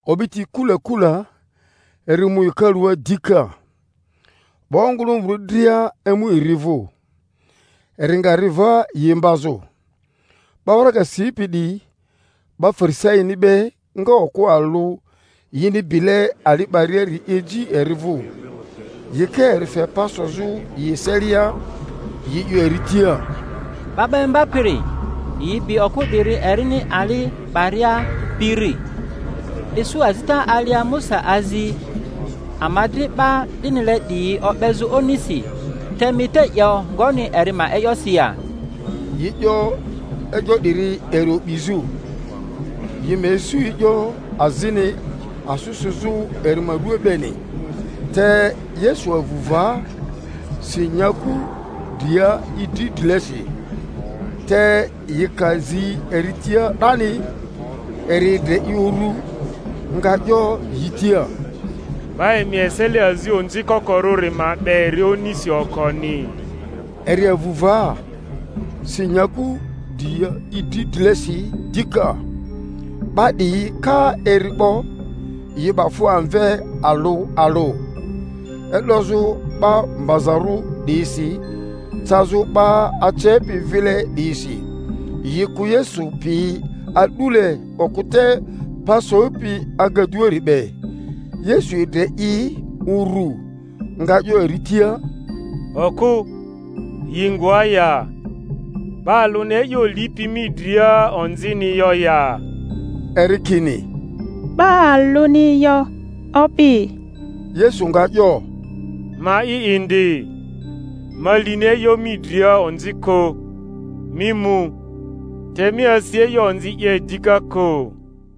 O'biti kula kula eri mu hekalua dika; 'ba ongᴜlᴜmᴜrᴜ dria emu eri vᴜ, eri nga ri va yi imbazᴜ. 'Ba waraga sipi 'diyi 'ba Fari-saini be nga okᴜ alᴜ yini bile ali 'bariari eji eri vᴜ; yi ka eri fe pa sozᴜ yi eselia, yi 'yo eri tia, Ba 'ba Imbapiri, yi bi okᴜ 'diri erini ali 'baria birri. Isu azita alia Musa azi ama dri 'ba 'dinile 'diyi o'bezᴜ onisi. Te mi te 'yo ngoni eri ma e'yosi ya? Yi 'yo e'yo 'diri eri o'bizᴜ, yi ma isu e'yo azini asᴜ sᴜzᴜ eri ma ruaa beni. Te Yesu avu va, si nyaku dria i dri drilesi. Te yi ka zi eri tia 'dani, eri edre i uru, nga 'yo yi tia, 'Ba emi eselia azi onzi kokorᴜri ma 'be eri onisi okoni. Eri avu va, si nyaku dria i dri drilesi dika. 'Ba 'diyi ka eri 'bo, yi 'ba fᴜ amve alᴜ alᴜ, e'dozᴜ 'ba mbazarᴜ 'diyisi cazᴜ 'ba acepi vile 'diyisi, yi kᴜ Yesu pi a'dule okᴜ te pa sopi agaduari be. Yesu edre i uru, nga 'yo eri tia, Okᴜ, yi ngoa ya? 'Ba alᴜni e'yo lipi mi dria onzini yo ya? Eri kini, 'Ba alᴜni yo, Opi. Yesu nga 'yo, Ma'i indi, ma lini e'yo mi dria onzi kᴜ; mi mu, te mi asi e'yo onzi 'ye dika kᴜ.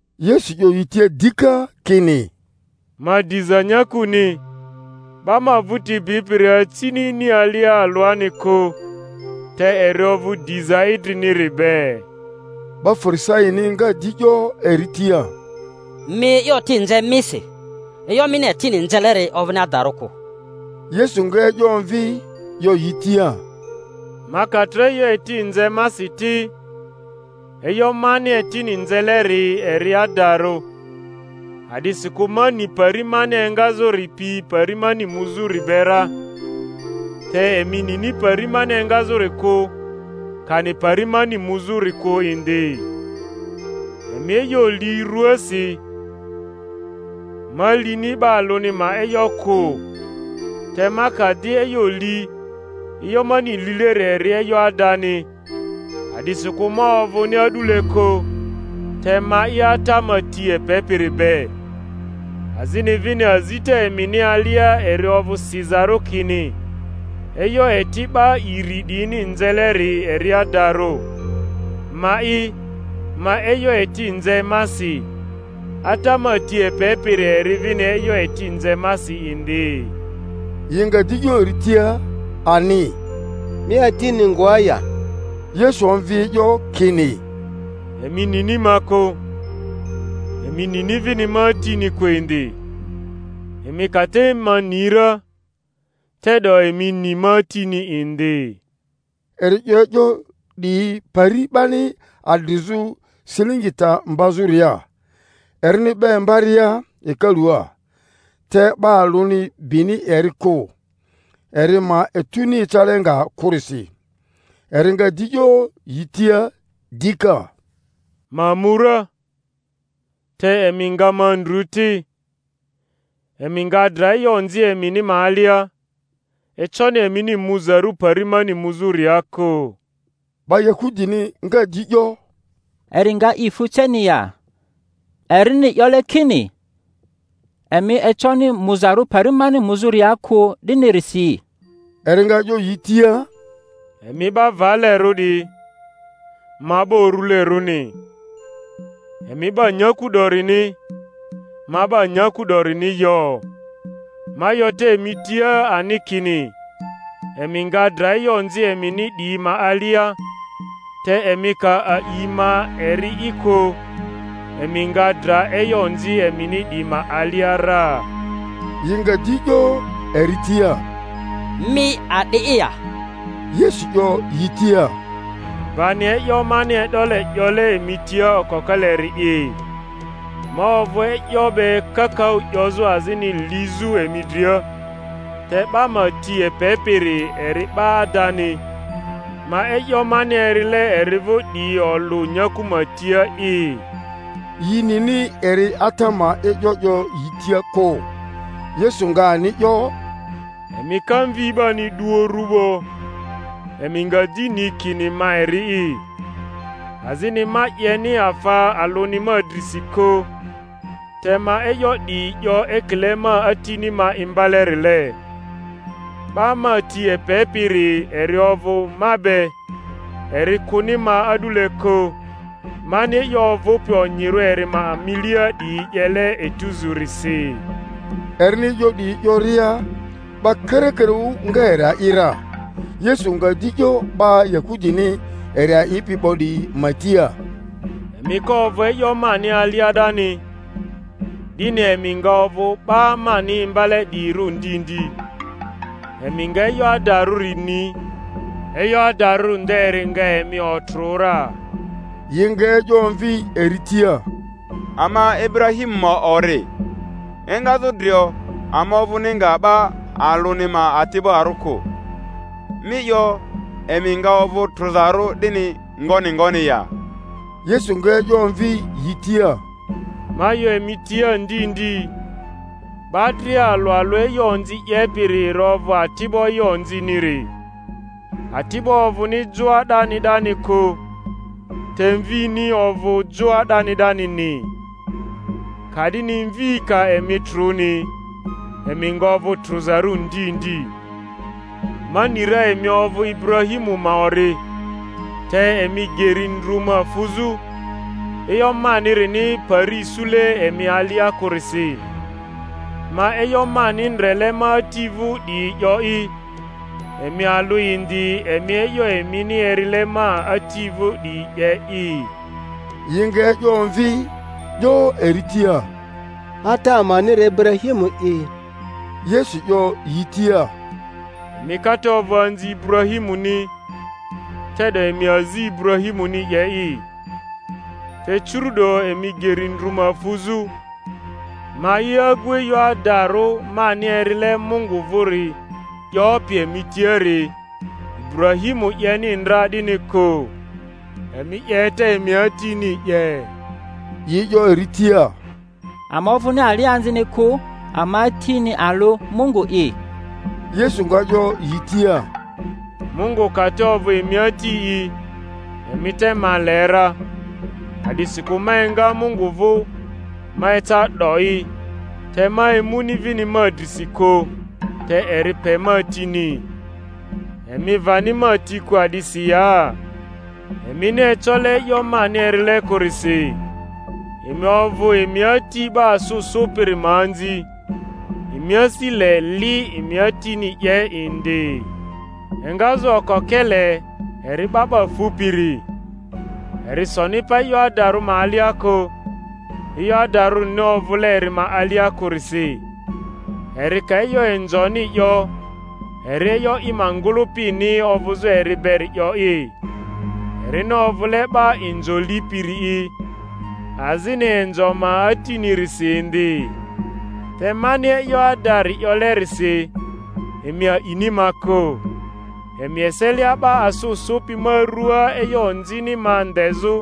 Yesu 'yo yi tia dika, kini, Ma diza nyakuni; 'ba ma vᴜti bipiri acini ini alia alᴜani kᴜ, te eri ovᴜ diza idriniri be. 'Ba Farisaini nga di 'yo eri tia, Mi e'yo eti nze misi; e'yo mini etini nzeleri ovᴜni adarᴜ kᴜ. Yesu nga e'yo omvi 'yo yi tia, Ma ka tro e'yo eti nze masi ti, e'yo mani etini nzeleri eri adarᴜ, a'disikᴜ ma ni pari mani engazᴜri pi pari mani muzᴜri be ra; te emi nini pari mani engazᴜri kᴜ, kani pari mani muzᴜri kᴜ indi. Emi e'yo li rᴜasi; ma lini 'ba alᴜni ma e'yo kᴜ. Te ma ka di e'yo li, e'yo mani lileri eri e'yo adani, a'disikᴜ ma ovᴜni a'dule kᴜ, te ma'i Ata ma ti epepiri be. Azini vini azita emini alia eri ovᴜ sizarᴜ kini e'yo eti 'ba iri 'diyini nzeleri eri adarᴜ. Ma'i ma e'yo eti nze masi, Ata ma ti epepiri eri vini e'yo eti nze masi indi. Yi nga di 'yo eri tia ani, Mi Atini ngoa ya? Yesu omvi e'yo kini, Emi nini ma kᴜ, emi nini vini ma Atini kᴜ indi; emi ka te ma ni ra, te'do emi ni ma Atini indi. Eri 'yo e'yo 'diyi pari 'bani adrizᴜ silingi ta mbazᴜria, erini 'ba imbaria hekalua; te 'ba alᴜni bini eri kᴜ, eri ma etuni ecale nga kᴜrisi. Eri nga di 'yo yi tia dika, Ma mu ra, te emi nga ma ndru ti, emi nga dra e'yo onzi emini ma alia; econi emini muzarᴜ pari mani muzᴜria kᴜ. 'Ba Yahudini nga di 'yo, Eri nga i fu ceni ya, erini 'yole kini, Emi econi muzarᴜ pari mani muzᴜria kᴜ, 'dinirisi? Eri nga 'yo yi tia, Emi 'ba valerᴜ 'diyi, ma 'ba urulerᴜni; emi 'ba nyaku 'dorini, ma 'ba nyaku 'dorini yo. Ma 'yo te emi tia ani kini emi nga dra e'yo onzi emini 'diyi ma alia; te emi ka a'i ma eri'i kᴜ, emi nga dra e'yo onzi emini 'diyi ma alia ra. Yi nga di 'yo eri tia, Mi a'di'i ya? Yesu 'yo yi tia, Bani e'yo mani e'dole 'yole emi tia okokeleri'i. Ma ovᴜ e'yo be kakaᴜ 'yozᴜ azini lizᴜ emi dria; te 'ba ma ti epepiri eri 'ba adani, ma e'yo mani erile eri vᴜ 'diyi olᴜ nyaku ma tia'i. Yi nini eri Ata ma e'yo 'yo yi tia kᴜ. Yesu nga ani 'yo, Emi ka Mvi 'bani 'du uru 'bo, emi nga di ni kini ma eri'i, azini ma 'yeni afa alᴜni ma drisi kᴜ, te ma e'yo 'diyi 'yo ekile ma Atini ma imbalerile. 'Ba ma ti epe-piri eri ovᴜ ma be; eri kᴜni ma a'dule kᴜ, mani e'yo ovᴜpi onyirᴜ eri ma milia 'diyi 'yele etuzurisi. Erini e'yo 'diyi 'yoria, 'ba karakaraᴜ nga eri a'i ra. Yesu nga di 'yo 'ba Yahudini eri a'ipi 'bo 'diyi ma tia, Emi ka ovᴜ e'yo mani alia 'dani, 'dini emi nga ovᴜ 'ba mani imbale 'diyirᴜ ndi ndi; emi nga e'yo adarᴜ ni, e'yo adarᴜ nderi nga emi otrᴜ ra. Yi nga e'yo omvi eri tia, Ama Iburahimu ma ori, engazᴜ drio ama ovᴜni nga 'ba alᴜni ma ati'barᴜ kᴜ. Mi 'yo, Emi nga ovᴜ trᴜzarᴜ, 'dini ngoni ngoni ya? Yesu nga e'yo omvi yi tia, Ma 'yo emi tia ndi ndi, 'ba dria alᴜ alᴜ e'yo onzi 'yepiri eri ovᴜ ati'bo e'yo onziniri. Ati'bo ovᴜni joa 'dani 'dani kᴜ, te mvini ovᴜ joa 'dani 'danini. Ka'dini Mvi ka emi trᴜni, emi nga ovᴜ trᴜzarᴜ ndi ndi. Ma ni ra emi ovᴜ Iburahimu ma ori; te emi geri ndru ma fᴜzᴜ, e'yo manirini pari isule emi alia kᴜrisi. Ma e'yo mani ndrele ma Ati vᴜ 'diyi 'yo'i, emi alᴜ indi emi e'yo emini erile emi ati vᴜ 'diyi 'ye'i. Yi nga e'yo omvi, 'yo eri tia, Ata amani eri Iburahimu'i. Yesu 'yo yi tia, Emi ka te ovᴜ anzi Iburahimuni, te'do emi azi Ibura-himuni 'ye'i, te curu'do emi geri ndru ma fuzᴜ, ma'i agu e'yo adarᴜ mani erile Mungu vᴜri 'yopi emi tiari; Iburahimu 'yeni ndra 'dini kᴜ. Emi 'yeta emi atini 'ye. Yi 'yo eri tia, Ama ovᴜni alianzini kᴜ; ama Atini alᴜ, Mungu’i. Yesu nga 'yo yi tia, Mungu ka te ovᴜ emi Ati'i, emi te ma le ra, a'disikᴜ ma enga Mungu vᴜ ma eca 'do'i; te ma emuni vini ma drisi kᴜ, te eri pe ma tini. Emi vani ma ti kᴜ a'disi ya? Emini ecole e'yo mani erile kᴜrisi. Emi ovᴜ emi ati 'ba asᴜ sᴜpiri ma anzi, emi asi le li emi atini 'ye indi. Engazᴜ okokele eri 'ba 'ba fupiri, eri soni pa e'yo adarᴜ ma alia kᴜ, e'yo adarurini ovᴜle eri ma alia kᴜrisi. Eri ka e'yo inzoni 'yo, eri e'yo i ma ngᴜlᴜpini ovᴜzᴜ eri beri 'yo'i, erini ovᴜle 'ba inzo lipiri'i, azini inzo ma atinirisi indi. Te mani e'yo adari 'yolerisi, emi a'ini ma kᴜ. Emi eselia 'ba asᴜ sᴜpi ma ruaa e'yo onzini ma ndezᴜ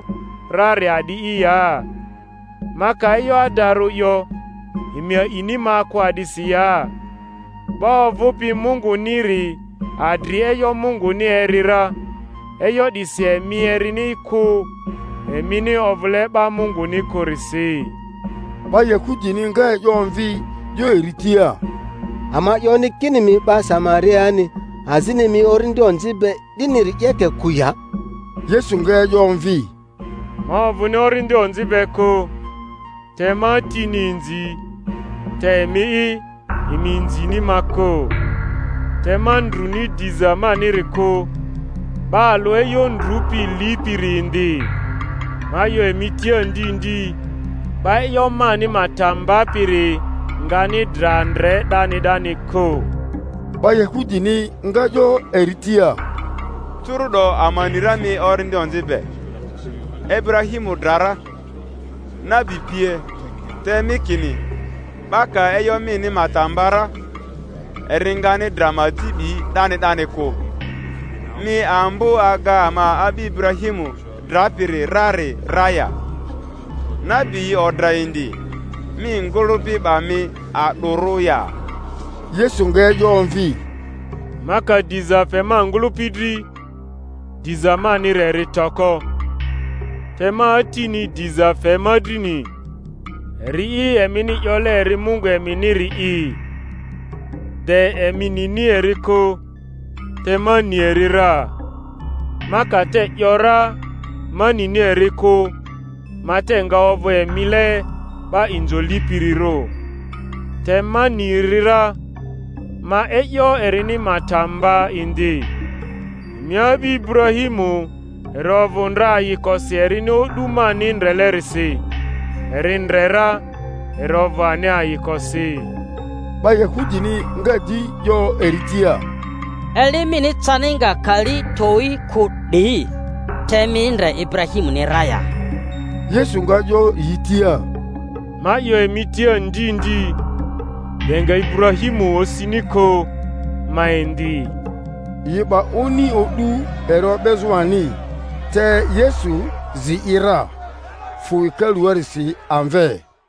rari a'di'i ya? Ma ka e'yo adarᴜ 'yo, emi a'ini ma kᴜ a'disi ya? 'Ba ovᴜpi Mungᴜniri adri e'yo Munguni eri ra; e'yo 'disi emi erini kᴜ, emini ovᴜle 'ba Munguni kᴜrisi. 'Ba Yahudini nga e'yo omvi 'yo eri tia, Ama 'yoni kini mi 'ba Samariani, azini mi orindi onzi be, 'diniri 'yeke kᴜ ya? Yesu nga e'yo omvi, Ma ovᴜni orindi onzi be kᴜ; te ma Atini inzi, te emi'i, emi inzini ma kᴜ. Te ma ndruni diza maniri kᴜ; 'ba alᴜ e'yo ndrupi lipiri indi. Ma 'yo emi tia ndi ndi, 'Ba e'yo mani ma ta mbapiri ngani dra ndre 'dani 'dani kᴜ. 'Ba Yahudini nga 'yo eri tia, Curu’do ama ni ra mi orindi onzi be. Iburahimu dra ra, nabi pie; te mi kini, 'Ba ka e'yo mini ma ta mba ra, eri ngani dra ma aji 'bi 'dani 'dani kᴜ. Mi ambo aga ama a'bi Iburahimu drapiri rari ra ya? Nabi yi odra indi! Mi ngᴜlᴜpi 'ba mi a'dᴜrᴜ ya? Yesu nga e'yo omvi, Ma ka diza fe ma ngᴜlᴜpi dri, diza maniri eri toko; te ma Atini diza fe ma drini, eri'i emini 'yole eri Mungu eminiri'i. De emi nini eri kᴜ; te ma ni eri ra. Ma ka te 'yo ra Ma nini eri kᴜ, ma te nga ovᴜ emile 'ba inzo lipirirᴜ; te ma ni eri ra, ma e'yo erini ma ta mba indi. Emi a'bi Iburahimu eri ovᴜ ndra ayikosi erini o'du mani ndrelerisi; eri ndre ra, eri ovᴜ ani ayikosi. 'Ba Yahudini nga di yo eri tia, Eli mini cani nga kali towyi kᴜ 'di, te mi ndre Iburahimuni ra ya? Yesu nga 'yo yi tia, Ma 'yo emi tia ndi ndi, de nga Iburahmiu osini kᴜ, ma indi. Yi 'ba oni o'du eri o'bezᴜ ani; te Yesu zi i ra, fᴜ hekaluarisi amve.